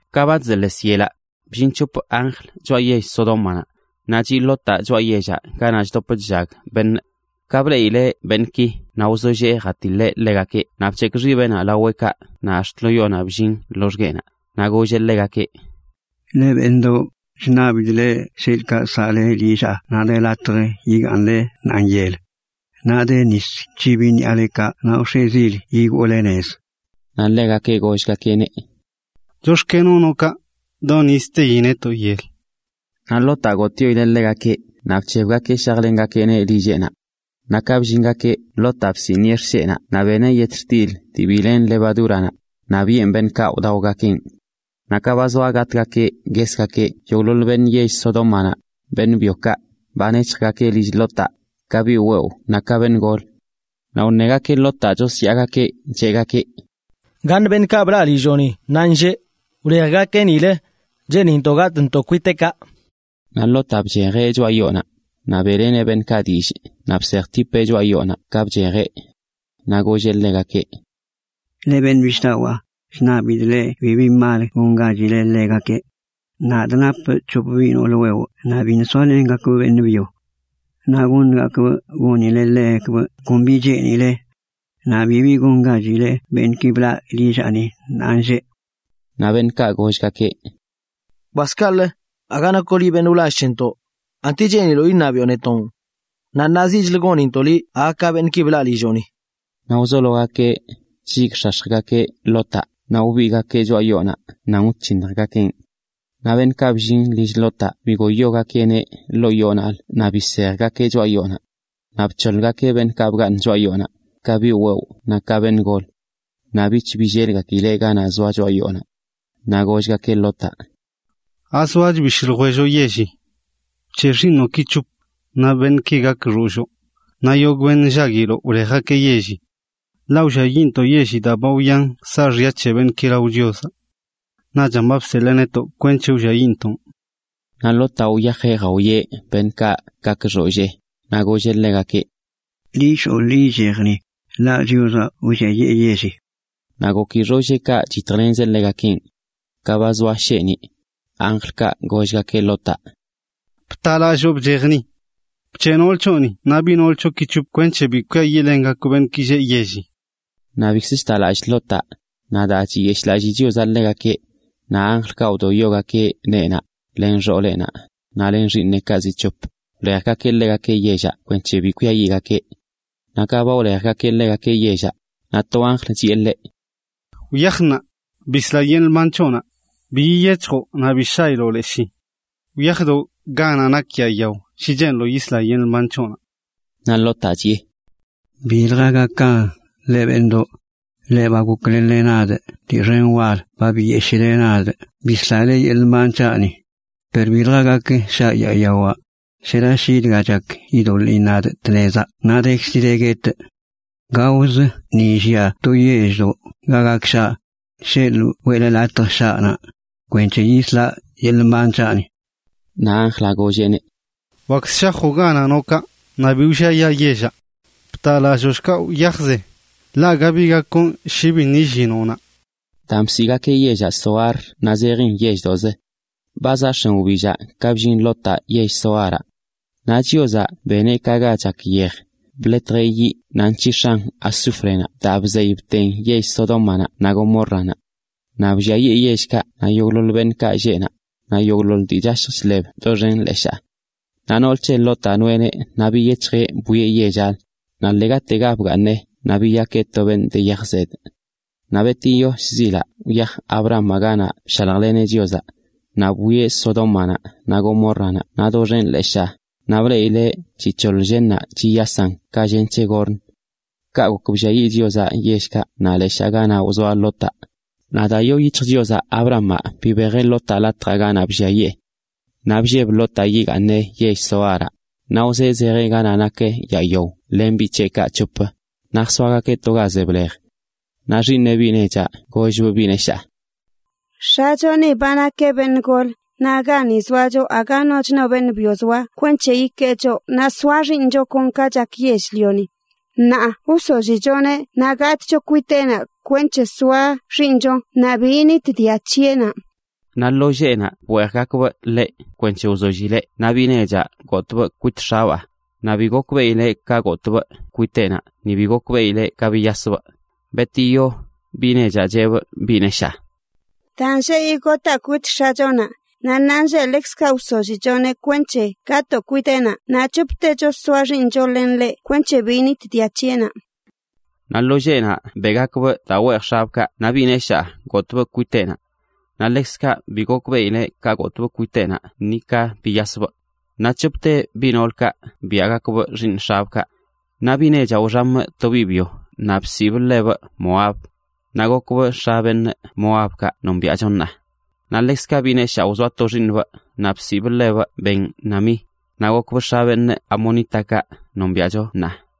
Ka ba chzeḻes yelaꞌ, bllin c̱hop anjl choꞌa yell Sodómanaꞌ, naꞌ chiꞌ Lotaꞌ choꞌa yellaꞌ ganaꞌ chdop chllag beṉꞌ. Ka bleꞌileꞌ beṉꞌki naꞌ wzollee jatiḻeꞌ ḻegakeꞌ naꞌ bc̱hekꞌ xibeꞌnaꞌ laweꞌkaꞌ naꞌ ax̱t lo yonaꞌ bllin loxgueꞌnaꞌ, naꞌ golleꞌ ḻegakeꞌ: ―Leꞌ beṉꞌdoꞌ, chṉabidꞌ leꞌ sheḻꞌkaꞌ saꞌle lillaa naꞌ de latj ga yigaaṉle ṉaanyel. Naꞌ de nis c̱hibi ṉiꞌalekaꞌ naꞌ wx̱e zil yigoole nez. Naꞌ gollgakeꞌneꞌ: ―Chox̱kenoꞌ noꞌ kaꞌ, do nizə teyi netoꞌ yel. Naꞌ Lotaꞌ gotꞌyoileꞌ ḻegakeꞌ naꞌ bc̱hebgakeꞌ shajlengakeꞌneꞌ lilleꞌnaꞌ. Ka bllingakeꞌ, Lotaꞌ bsiꞌniꞌe xsheꞌnaꞌ naꞌ beneꞌ yetxtil dii bi len levadúranaꞌ, naꞌ biꞌen beṉꞌkaꞌ wdaogakeꞌn. Naꞌ ka ba zoa gatꞌgakeꞌ, yogꞌḻoḻ beṉꞌ yell Sodómanaꞌ, beṉꞌ byokaꞌ, ba nec̱hjgakeꞌ lill Lotaꞌ, ka biꞌ wewꞌ naꞌ ka beṉꞌ golə. Naꞌ wṉegakeꞌ Lotaꞌ, chosyaagakeꞌ, cheꞌgakeꞌ: ―¿Gaṉ beṉꞌkaꞌ blaꞌ lillooni ṉaanlleꞌ? ¡Wlejgakeꞌ nilə! ¡Cheenintoꞌ gatꞌntoꞌ kwiteꞌkaꞌ! Naꞌ Lotaꞌ bchejeꞌ choꞌa yoonaꞌ, naꞌ beꞌleneꞌ beṉꞌkaꞌ dillꞌ naꞌ bsejtipeꞌ choꞌa yoonaꞌ ka bchejeꞌ. Naꞌ golleꞌ ḻegakeꞌ: ―Leꞌ beṉꞌ bishꞌdawaa, chṉabidꞌ leꞌ bibi mal gongachile ḻegakeꞌ. Nadꞌ napꞌ c̱hop biꞌ noolə wewꞌ naꞌ biṉꞌ soalengakbꞌ beṉꞌ byo. Naꞌ goṉgakꞌbꞌ gonilegakbꞌ kon bi cheenile. Naꞌ bibi gongachile beṉꞌki blaꞌ lillaꞌni ṉaanlleꞌ. Naꞌ beṉꞌkaꞌ gollgakeꞌ: ―¡Kwas kaꞌlə! Aga nakoꞌ liꞌ beṉꞌ wlall c̱hentoꞌ, ¿anti cheeniloꞌ iṉabiꞌo netonꞌ? ¡Naꞌ ṉaa ziꞌchlə gonintoꞌ liꞌ aga ka beṉꞌki blaꞌ lilloꞌni! Naꞌ wzologakeꞌ chlligꞌx̱ax̱jgakeꞌ Lotaꞌ naꞌ wbigꞌgakeꞌ choꞌa yoonaꞌ nan wc̱hinjgakenꞌ. Naꞌ beṉꞌkaꞌ bllin lill Lotaꞌ bigoyogakeꞌneꞌ ḻoo yoonaꞌlə naꞌ bisejgakeꞌ choꞌa yoonaꞌ. Naꞌ bc̱hoḻgakeꞌ beṉꞌkaꞌ bgaaṉ choꞌa yoonaꞌ, ka biꞌ wewꞌ naꞌ ka beṉꞌ golə. Naꞌ bich billelgakileꞌ ganaꞌ zoa choꞌa yoonaꞌ. Naꞌ gollgakeꞌ Lotaꞌ: ―¿Azoach bishꞌ ljwelloꞌ yelli? Bc̱heꞌ xiiṉoꞌki c̱hop, naꞌ beṉꞌkaꞌ gak xoolloo, naꞌ yogꞌ beṉꞌ nllaguiloꞌ, wlejgakeꞌ yelli. Ḻaꞌ wlliayiꞌntoꞌ yelli, daa ba wyante saaxya c̱he beṉꞌki lao Chiozaꞌ. Naꞌchan ba bseḻee netoꞌ kwenc̱he wlliayiꞌntoꞌn. Naꞌ Lotaꞌ wyajeꞌ jawieꞌ beṉꞌkaꞌ gak xoollee, naꞌ golleꞌ ḻegakeꞌ: ―¡Ḻi shoo, ḻi ichej ni, ḻaꞌ Chiozaꞌ wlliayee yelli! Naꞌ goki xoolleekaꞌ chyitjlenzeꞌ ḻegakenꞌ. Ka ba zoa sheeniꞌ, anjlkaꞌ gollgakeꞌ Lotaꞌ: ―Btalalloo bchej ni. Bc̱heꞌ nool c̱hoꞌni naꞌ biꞌ noolə c̱hoꞌki c̱hop kwenc̱he bi kwiayiꞌlenle beṉꞌki lleꞌ yelli. Naꞌ bikzə chta lallꞌ Lotaꞌ, naꞌ daa chiyeshꞌlalli Chiozaꞌ ḻegakeꞌ, naꞌ anjlkaꞌ wdoyogakeꞌ neenaꞌ, len xooleꞌnaꞌ, naꞌ len xiiṉeꞌkaꞌ zi c̱hop, wlejgakeꞌ ḻegakeꞌ yellaꞌ kwenc̱he bi kwiayiꞌgakeꞌ. Naꞌ ka ba wlejgakeꞌ ḻegakeꞌ yellaꞌ, naꞌ to anjlaꞌ chiꞌe ḻeꞌ: ―Wyaj ṉaa, bisla yeḻꞌ mban c̱hoꞌnaꞌ; bi yiyec̱hjoꞌ naꞌ bi shailoꞌ leshii. Wyajdo ga nak yaa yao shi cheeniloꞌ yisla yeḻꞌ mban c̱hoꞌnaꞌ. Naꞌ Lotaꞌ chiꞌe: ―Bilja gakan, leꞌ beṉꞌdoꞌ. Leꞌ ba goklenle nadꞌ dii xen wal ba biyeshile nadꞌ bislale yeḻꞌ mban c̱haꞌni. Per bilja gak shaꞌ yaa yawaꞌ, shera shi dga chak yidoḻiin nadꞌ tnezaꞌ naꞌ dekzi de guetꞌ. Gaozə ni llia to yelldoꞌ ga gak shaꞌ, sheḻꞌ weꞌle latj shaꞌ naꞌ, kwenc̱he yisla yeḻꞌ mban c̱haꞌni. Naꞌ anjlaꞌ golleꞌneꞌ: ―Wakzə shajoꞌ ganaꞌ noꞌ kaꞌ, naꞌ bi wlliayaa yellaꞌ. ¡Bta lalloo shkaꞌ wyajze!, ḻaꞌ aga bi gak gonꞌ shi biṉꞌ illinoꞌ naꞌ. Daan bsiꞌgakeꞌ yellaꞌ Zoar naꞌ zejin yelldoꞌzə. Ba zaꞌ x̱en wbillaꞌ ka bllin Lotaꞌ yell Zoaraꞌ. Naꞌ Chiozaꞌ beneꞌ ka ga chak yej, bḻetjeꞌ yiꞌ naꞌ nc̱hix̱an azúfrenaꞌ daa bzey bten yell Sodómanaꞌ naꞌ Gomórranaꞌ. Naꞌ blliayee yellkaꞌ naꞌ yogꞌḻoḻ beṉꞌkaꞌ lleꞌ naꞌ, naꞌ yogꞌḻoḻ dii chashj chḻeb doxen leshaa. Naꞌ nool c̱he Lotaꞌ noeꞌneꞌ naꞌ biyec̱hjeꞌ bwieꞌ yell Sodómanaꞌ, naꞌ ḻegatega bgaaṉeꞌ naꞌ biyakeꞌ to beṉꞌ de yaj zedꞌ. Naꞌ betiyo shzilaꞌ wyaj Abrahamaꞌ ganaꞌ bshaljleneꞌ Chiozaꞌ, naꞌ bwieꞌ Sodómanaꞌ naꞌ Gomórranaꞌ naꞌ doxen leshaa, naꞌ bleꞌileꞌ chic̱hoḻ llennaꞌ chiyasan ka llen c̱he gorn. Kaꞌ gok blliayiꞌ Chiozaꞌ yellkaꞌ naꞌ leshaa ganaꞌ wzoa Lotaꞌ, naꞌ daa yoo yic̱hj Chiozaꞌ Abrahamaꞌ bibejeꞌ Lotaꞌ latjaꞌ ganaꞌ blliayee. Naꞌ blleb Lotaꞌ yigaaṉeꞌ yell Zoaraꞌ, naꞌ wzee zejeꞌ ganaꞌ nak yaa yao len biꞌ c̱heꞌkaꞌ c̱hop, naꞌ jsoagakeꞌ to ga ze blej. Naꞌ xiiṉeꞌ biꞌ nechaꞌ gollbꞌ biꞌ neshaa: ―X̱acho ni ba nakeꞌ beṉꞌ gol naꞌ gani zoacho aga noch no beṉꞌ byo zoa kwenc̱he ikee choꞌ naꞌ soa xiiṉcho kon ka chak yell-lioni. Ṉaa wsollichoneꞌ naꞌ gatꞌcho kwiteꞌnaꞌ kwenc̱he soa xiiṉcho naꞌ bi yinit dia c̱heꞌnaꞌ. Naꞌ lo lleꞌnaꞌ bweejgakbꞌ ḻeꞌ kwenc̱he wzollileꞌ naꞌ biꞌ nechaꞌ gotbꞌ kwit x̱abaa, naꞌ bi gokbeꞌileꞌ ka gotbꞌ kwiteꞌnaꞌ ni bi gokbeꞌileꞌ ka biyasbꞌ. Naꞌ betiyo, biꞌ nechaꞌ cheꞌbꞌ biꞌ neshaa: ―Daa nlleyiꞌ gotaa kwit x̱achonaꞌ; naꞌ ṉaanlleꞌ ḻekzkaꞌ wsollichoneꞌ kwenc̱he gatoo kwiteꞌnaꞌ, naꞌ c̱hoptecho soa xiiṉcho len ḻeꞌ kwenc̱he bi yinit dia c̱heꞌnaꞌ. Naꞌ lo lleꞌnaꞌ beꞌgakbꞌ daa weej x̱abꞌkaꞌ naꞌ biꞌ neshaa gotbꞌ kwiteꞌnaꞌ. Naꞌ ḻekzkaꞌ bi gokbeꞌileꞌ ka gotbꞌ kwiteꞌnaꞌ ni ka biyasbꞌ. Naꞌ c̱hopte biꞌ noolkaꞌ biaꞌgakbꞌ xiiṉ x̱abꞌkaꞌ. Naꞌ biꞌ nechaꞌ wxamꞌ to biꞌ byo naꞌ bsiꞌbꞌ ḻebꞌ Moab, naꞌ gokbꞌ x̱a beṉꞌ Moabkaꞌ nombiaꞌcho ṉaa. Naꞌ ḻekzkaꞌ biꞌ neshaa wzoa to xiiṉbꞌ naꞌ bsiꞌbꞌ ḻebꞌ Ben-ammi, naꞌ gokbꞌ x̱a amonítakaꞌ nombiaꞌcho ṉaa.